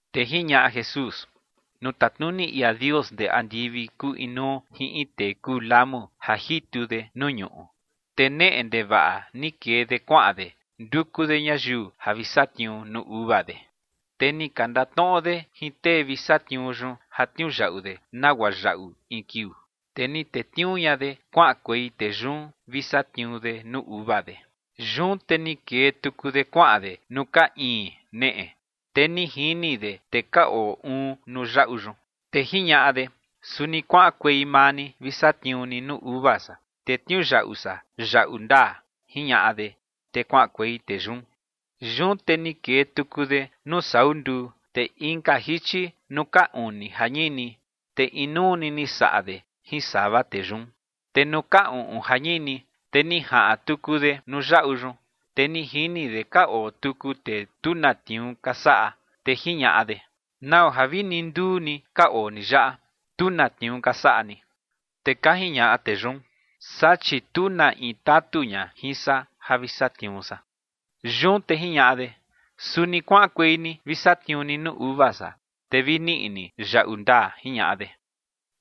Te jiñaꞌa Jesús: ͏―͏Nuu tatnuni ia Dios ndee andivi kuu inuu jin in tee kuu lamu ja jitu de nuu ñuꞌu. Te neꞌe ndevaꞌa ni kee de kuaꞌan de nduku de ñayiu ja vi satniuu nuu uva de. Te ni ka ndatnoꞌo de jin tee vi satniuu yun ja tniuyaꞌu de nagua yaꞌu in kiuu. Te ni tetniuu ña de kuaꞌankuei tee yun vi satniuu de nuu uva de. Yun te ni kee tuku de kuaꞌan de nuu ka iin neꞌe, te ni jini de tee ka oo uun nuu yaꞌu yun. Te jiñaꞌa de: “Suni kuaꞌankuei maa ni vi satniuu ni nuu uva san, te tniuyaꞌu san yaꞌu ndaa”, jiñaꞌa de, te kuaꞌankuei tee yun. Yun te ni kee tuku de nuu sau nduu, te inka jichi nuu ka uni ja ñini, te inuu ni ni saꞌa de jin sava tee yun. Te nuu ka uꞌun ja ñini, te ni jaꞌan tuku de nuu yaꞌu yun, te ni jini de ka oo tuku tee tu na tniuu ka saꞌa, te jiñaꞌa de: “¿Nau ja vini nduu ni ka oo ni yaꞌa, tu na tniuu ka saꞌa ni?” Te ka jiñaꞌa tee yun: “Saa, chi tu na in tatu ña jin san ja vi satniuu san”. Yun te jiñaꞌa de: “Suni kuaꞌankuei ni vi satniuu ni nuu uva san, te vi niꞌi ni yaꞌu ndaa”, jiñaꞌa de.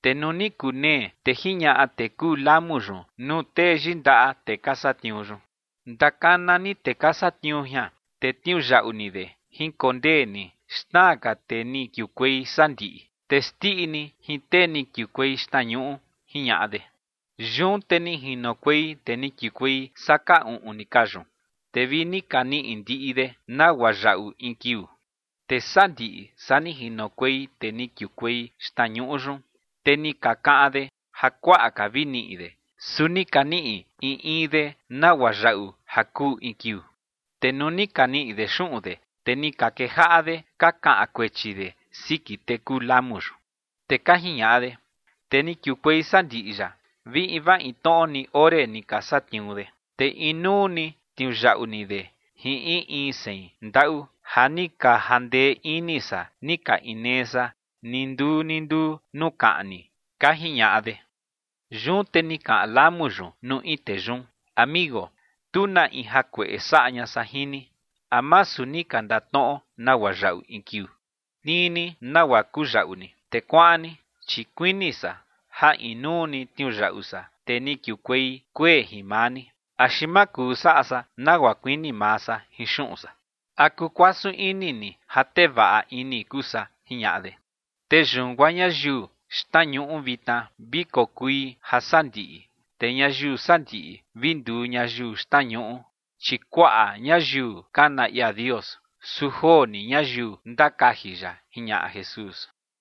’Te nuu ni kunee, te jiñaꞌa tee kuu lamu yun nuu tee yindaꞌa tee ka satniuu yun: “Ndakana ni tee ka satniuu jian, te tniuyaꞌu ni de. Jinkondee ni xna ka tee ni kiukuei sandiꞌi, te xndiꞌi ni jin tee ni kiukuei xtnañuꞌu”, jiñaꞌa de. Yun te ni jinokuei tee ni kiukuei saa ka uꞌun ni ka yun, te vi ni ka niꞌi ndiꞌi de nagua yaꞌu in kiuu. Te sandiꞌi saa ni jinokuei tee ni kiukuei xtnañuꞌu yun, te ni ka kaꞌan de ja kuaꞌa ka vi niꞌi de, su ni ka niꞌi in in de nagua yaꞌu ja kuu in kiuu. Te nuu ni ka niꞌi de xuꞌun de, te ni ka kejaꞌa de ka kaꞌan kuechi de siki tee kuu lamu yun. Te ka jiñaꞌa de: “Tee ni kiukuei sandiꞌi yaꞌa vi invaa in tnoꞌo ni ore ni ka satniuu de, te inuu ni tniuyaꞌu ni de jin in in sein ndaꞌu ja ni ka jandee ini san ni ka inee san ni nduu ni nduu nuu kaꞌni”, ka jiñaꞌa de. Yun te ni kaꞌan lamu yun nuu in tee yun: “Amigo, tu na in jakueꞌe saꞌa ña san jin ni. ¿A masu ni ka ndatnoꞌo nagua yaꞌu in kiuu? Tnii ni nagua kuu yaꞌu ni, te kuaꞌan ni, chi kuini san ja inuu ni tniuyaꞌu san tee ni kiukuei kuee jin maa ni. ¿Axi ma kuu saꞌa san nagua kuini maa san jin xuꞌun san? ¿A kukuasun ini ni ja tee vaꞌa ini kuu san?” jiñaꞌa de. Te yun guaa ñayiu xtnañuꞌu vitna vi kokui jasandiꞌi, te ñayiu sandiꞌi vi nduu ñayiu xtnañuꞌu. Chi kuaꞌa ñayiu kana ia Dios, su joo ni ñayiu ndakaji ya ͏―͏jiñaꞌa Jesús.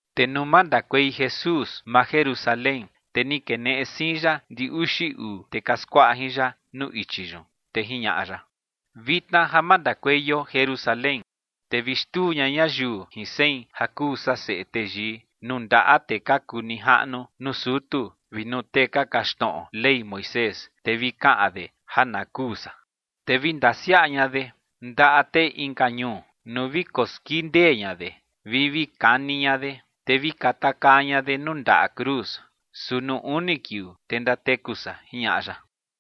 Te nuu mandakuei Jesús maa Jerusalén, te ni keneꞌe siin ya ndi uxi uu tee ka skuaꞌa jin ya nuu ichi yun, te jiñaꞌa ya: ͏―͏Vitna ja mandakueio Jerusalén, te vi xtuu ña ñayiu jin sein ja kuu san Seꞌe Teyii nuu ndaꞌa tee ka kuu nijaꞌnu nuu sutu vi nuu tee ka kaxtnoꞌo Ley Moisés, te vi kaꞌan de ja na kuu san. Te vi ndasiaꞌa ña de ndaꞌa tee inka ñuu, nuu vi koskindee ña de, vi vi kani ña de, te vi katakaa ña de nuu ndaꞌa cruz. Su nuu uni kiuu, te ndateku san ͏―͏jiñaꞌa ya.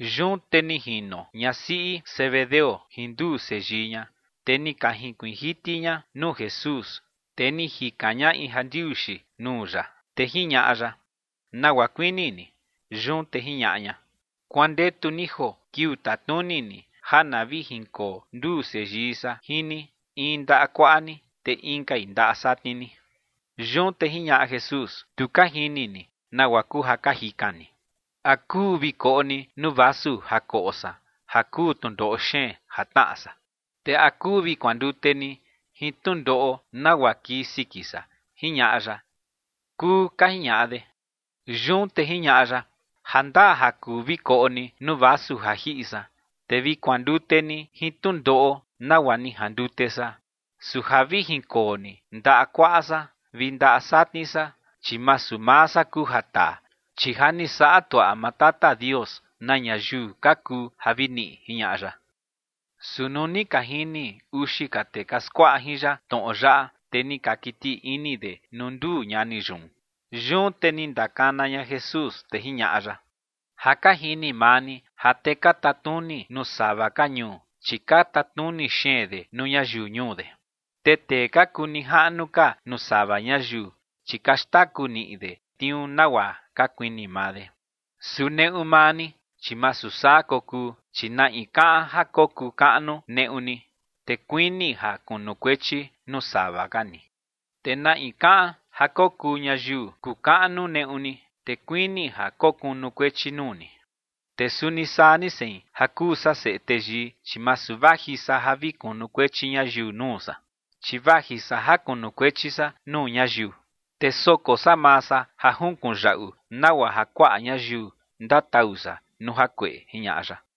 Yun te ni jino ñasiꞌi Zebedeo jin nduu seyii ña, te ni ka jinkuiin jiti ña nuu Jesús, te ni jikan ña in jandiuxi nuu ya. Te jiñaꞌa ya: ͏―͏¿Nagua kuini ni? Yun te jiñaꞌa ña: ͏―͏Kuandetu ni joo kiuu tatnuni ni ja na vi jinkoo nduu seyii san jin ni, in ndaꞌa kuaꞌa ni, te inkai ndaꞌa satni ni. Yun te jiñaꞌa Jesús: ͏―͏Tu ka jini ni nagua kuu ja ka jikan ni. ¿A kuu vi koꞌo ni nuu vasu ja koꞌo san ja kuu tnundoꞌo xeen ja tnaꞌa san? ¿Te a kuu vi kuandute ni jin tnundoꞌo nagua kii siki san? ͏―͏jiñaꞌa ya. ͏―͏Kuu ͏―͏ka jiñaꞌa de. Yun te jiñaꞌa ya: ͏―͏Ja ndaa ja kuu vi koꞌo ni nuu vasu ja jiꞌi san, te vi kuandute ni jin tnundoꞌo nagua ni jandute san, su ja vi jinkoo ni ndaꞌa kuaꞌa san vi ndaꞌa satni san, chi masu maa san kuu ja taa, chi ja ni saꞌa tuaꞌa maa Tata Dios na ñayiu ka kuu ja vi niꞌi ͏―͏jiñaꞌa ya. Su nuu ni ka jini uxi ka tee ka skuaꞌa jin ya tnoꞌo yaꞌa, te ni ka kiti ini de nuu nduu ñani yun. Yun te ni ndakana ña Jesús, te jiñaꞌa ya: ͏―͏Ja ka jini maa ni ja tee ka tatnuni nuu sava ka ñuu, chi ka tatnuni xeen de nuu ñayiu ñuu de. Te tee ka kuu nijaꞌnu ka nuu sava ñayiu, chi ka xtaku niꞌi de tniuu nagua ka kuini maa de. Su neꞌu maa ni, chi masu saa kokuu, chi na in kaꞌan ja kokuu kaꞌnu neꞌu ni, te kuini ja kunukuechi nuu sava ka ni. Te na in kaꞌan ja kokuu ñayiu kukaꞌnu neꞌu ni, te kuini ja kokunukuechi nuu ni. Te suni saa ni sein ja kuu san Seꞌe Teyii, chi masu vaji san ja vi kunukuechi ñayiu nuu san, chi vaji san ja kunukuechi san nuu ñayiu, te soko san maa san ja junkuꞌun yaꞌu nagua ja kuaꞌa ñayiu ndatau san nuu jakueꞌe ͏―͏jiñaꞌa ya.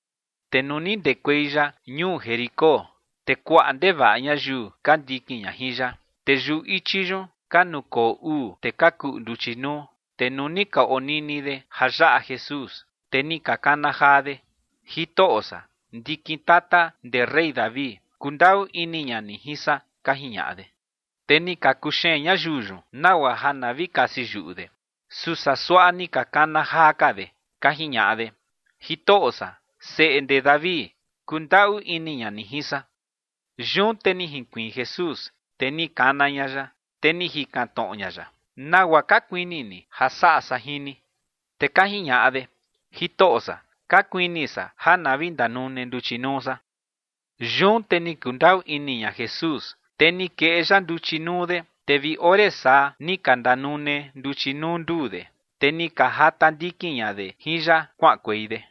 Te nuu ni ndekuei ya ñuu Jericó, te kuaꞌa ndevaꞌa ñayiu ka ndikin ña jin ya. Te yuꞌu ichi yun ka nukoo uu tee ka kuꞌu nduchi nuu. Te nuu ni ka onini de ja yaꞌa Jesús, te ni ka kana jaa de: ͏―͏Jitoꞌo san, ndikin tata ndee rey David, kundaꞌu ini ña ni jin san ͏―͏ka jiñaꞌa de. Te ni ka kuxeen ñayiu yun nagua ja na vi kasi yuꞌu de. Su saa suaꞌa ni ka kana jaa ka de, ka jiñaꞌa de: ͏―͏Jitoꞌo san, Seꞌe ndee David, kundaꞌu ini ña ni jin san. Yun te ni jinkuiin Jesús, te ni kana ña ya, te ni jikan tnoꞌo ña ya: ͏―͏¿Nagua ka kuini ni ja saꞌa san jin ni? Te ka jiñaꞌa de: ͏―͏Jitoꞌo san, ka kuini san ja na vi ndanune nduchi nuu san. Yun te ni kundaꞌu ini ña Jesús, te ni keꞌe ya nduchi nuu de, te vi ore saa ni ka ndanune nduchi nuu nduu de, te ni ka jata ndikin ña de jin ya kuaꞌankuei de.